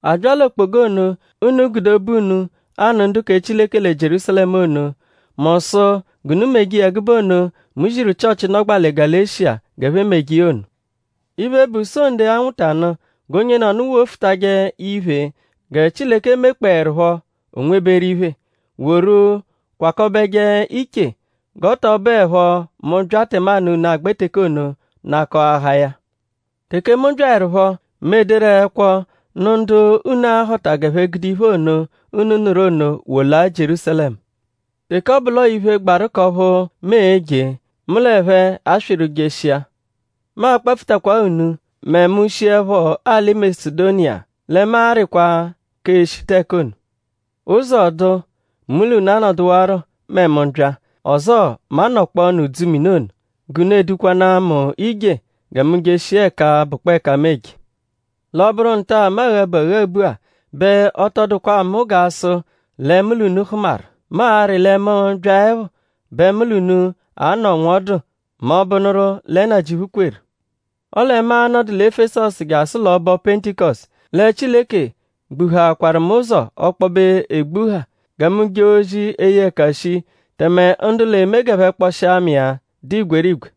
A bya l'okpoga ono, unu gude obu unu anụ ndu kẹ Chileke lẹ Jierúsalẹmu ono; mu sụ g'unu meje iya ẹgube ono, mu ziru Chịochi, nọgbaa lẹ Galeshiya g'ẹphe meje iya ono. Iphe, bụ Sonde, a-nwụta nụ g'onyenọnu wofutajẹ iphe gẹ Chileke mekpọerupho o nweberu iphe; woru kwakọbeje iche; g'ọ tọ bụepho mu -bya tẹmanu unu agbẹ teke ono nakọahaa ya. Teke mu byaẹrupho; mu ederu ẹkwo nụ ndu unu a-họta g'ẹphe gude iphe ono, unu nụru ono wolaa Jierúsalẹmu. Teke ọ bụ l'ọo iphe, gbaru k'ọphu mu e-je; mu l'ẹphe aswịru jeshia. Mu a-kpapfutakwaa unu mẹ mu -shiẹpho alị Masedoniya; lẹ mu arịkwa k'eshita ẹka ono. Ụzo -dụ; mu l'unu anọduwaro mẹ mu -bya; ọzoo mu a-nọkpoonu udzumini ono; g'unu edukwanaa mu ije gẹ mu jeshia ẹka bụkpoo ẹka mu eje. L'ọ -bụru nta-a, mu aghabu aghabu-a bẹ ọ tọ dụkwa mu g'a sụ lẹ mu l'unu hụmaru. Mu arị lẹ mu -byaẹpho bẹ mu l'unu a-nọ nwọdu mẹ ọ -bụnuru lẹ Nnajịuphu kweru. Ọle mu a-nọdu lẹ Efesọsu jasụ l'ọbo Pentikọsutu. Lẹ Chileke gbuhaakwaru mu ụzo ọkpobe egbuha gẹ mu jee ozi, e-ye ẹka shi; tẹme ndu l'eme g'ẹphe kpọshia mu iya dụ igwerigwe.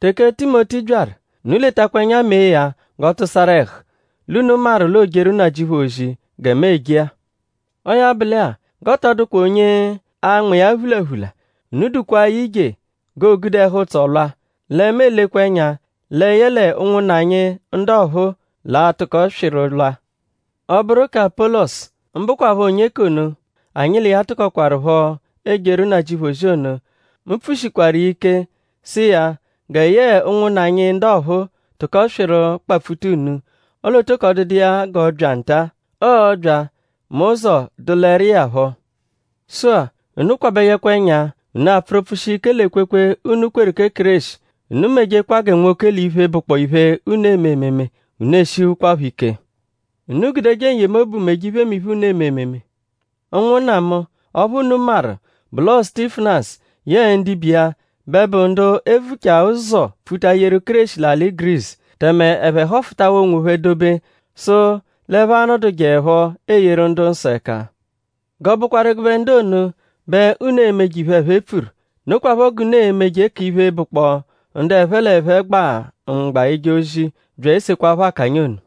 Teke Timoti byaru; unu letakwa ẹnya mee ya g'ọ tụsaru ẹhu. L'unu maru l'oojeru Nnajịuphu ozi gẹ mu eje-a. Ọo ya bụ lẹ-a; g'ọ tọ dụkwa onye a-nma iya phulaphula. Unu dukwaa ya ije; g'oogude ẹhu-ụtso lwa; lẹ mu elekwa ẹnya lẹ yẹle ụnwunna anyi ndu ọphuu l'a-tụko swịru lwa. Ọ -bụru kẹ Apọlosu; mbụkwapho onye k'ono, anyi l'iya tụkokwarupho ejeru Nnajịuphu ozi ono; mu pfushikwaru iya ike sụ iya gẹ yẹe ụnwunna anyi ndu ọphuu tụko swịru kpapfuta unu; ọle ọ tọko dụdu iya g'ọ bya nta-a. Ọo-bya mẹ ụzo dụleru iya phọ. Sụ-a; unu kwabẹjekwa ẹnya; unu apfụru pfụshia ike l'ekwekwe, unu kweru kẹ Kéreshi; unu mejekwa gẹ nwoke l'iphe, bụkpoo iphe, unu eme ememe; unu eshihukwaphọ ike. Unu gudeje n-yemobu meje iphemiphe, unu eme ememe. Ụnwunna mu; ọphu unu maru bụ l'ọo Sutifanasu yẹe ndibe iya bẹ bụ ndu e vuchaa ụzo pfuta yeru Kéreshi l'alị Gurisu; tẹme ẹphe họfutawaa onwophẹ dobe; sụ l'ẹphe a-nọdujeepho eyeru ndu-nsọ ẹka. G'ọ bụkwaru ẹgube ndu ono bẹ unu e-meje iphe, ẹphe pfuru. Nokwaphọ g'unu e-meje k'iphe, bụkpoo ndu ẹphe l'ẹphe gba mgba eje ozi bya esekwaphọ akanya ono.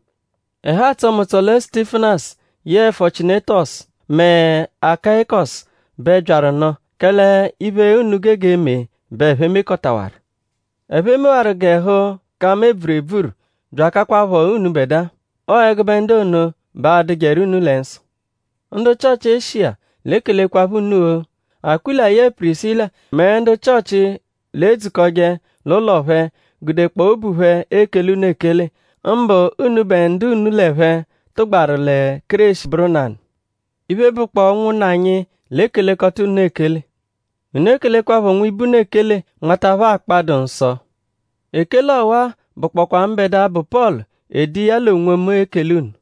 Ẹhu atsọ mu ụtso lẹ Sutifanasu yẹe Fochiunetọsu mẹ Akayikọsu bẹ byaru nụ; kẹle iphe, unu gege eme bẹ ẹphe mekọtawaru. Ẹphe mewaru g'ẹhu ka mu ebvuru ebvuru bya akakwaphọ unubẹdua. Ọo ẹgube ndu ono bẹ a-dụjeru unu lẹ nsọ. Ndu Chịochi Eshiya l'ekelekwaphọ unu-o. Akwịla yẹe Pirisila mẹ ndu Chịochi, l'edzukọje l'ụlo phẹ gudekpọo obu phẹ ekele unu ekele; mbụ unubẹ ndu unu l'ẹphe tụgbaru lẹ Kéreshi bụru nanụ. Iphe, bụkpoo ụnwunna anyi l'ekelekọta unu ekele. Unu ekelekwaphọ nwibe unu ekele nmata phẹ akpa, dụ nsọ. Ekele ọwa-a bụkpokwaa mbẹdua, bụ Pọlu ede iya l'onwomu ekele unu.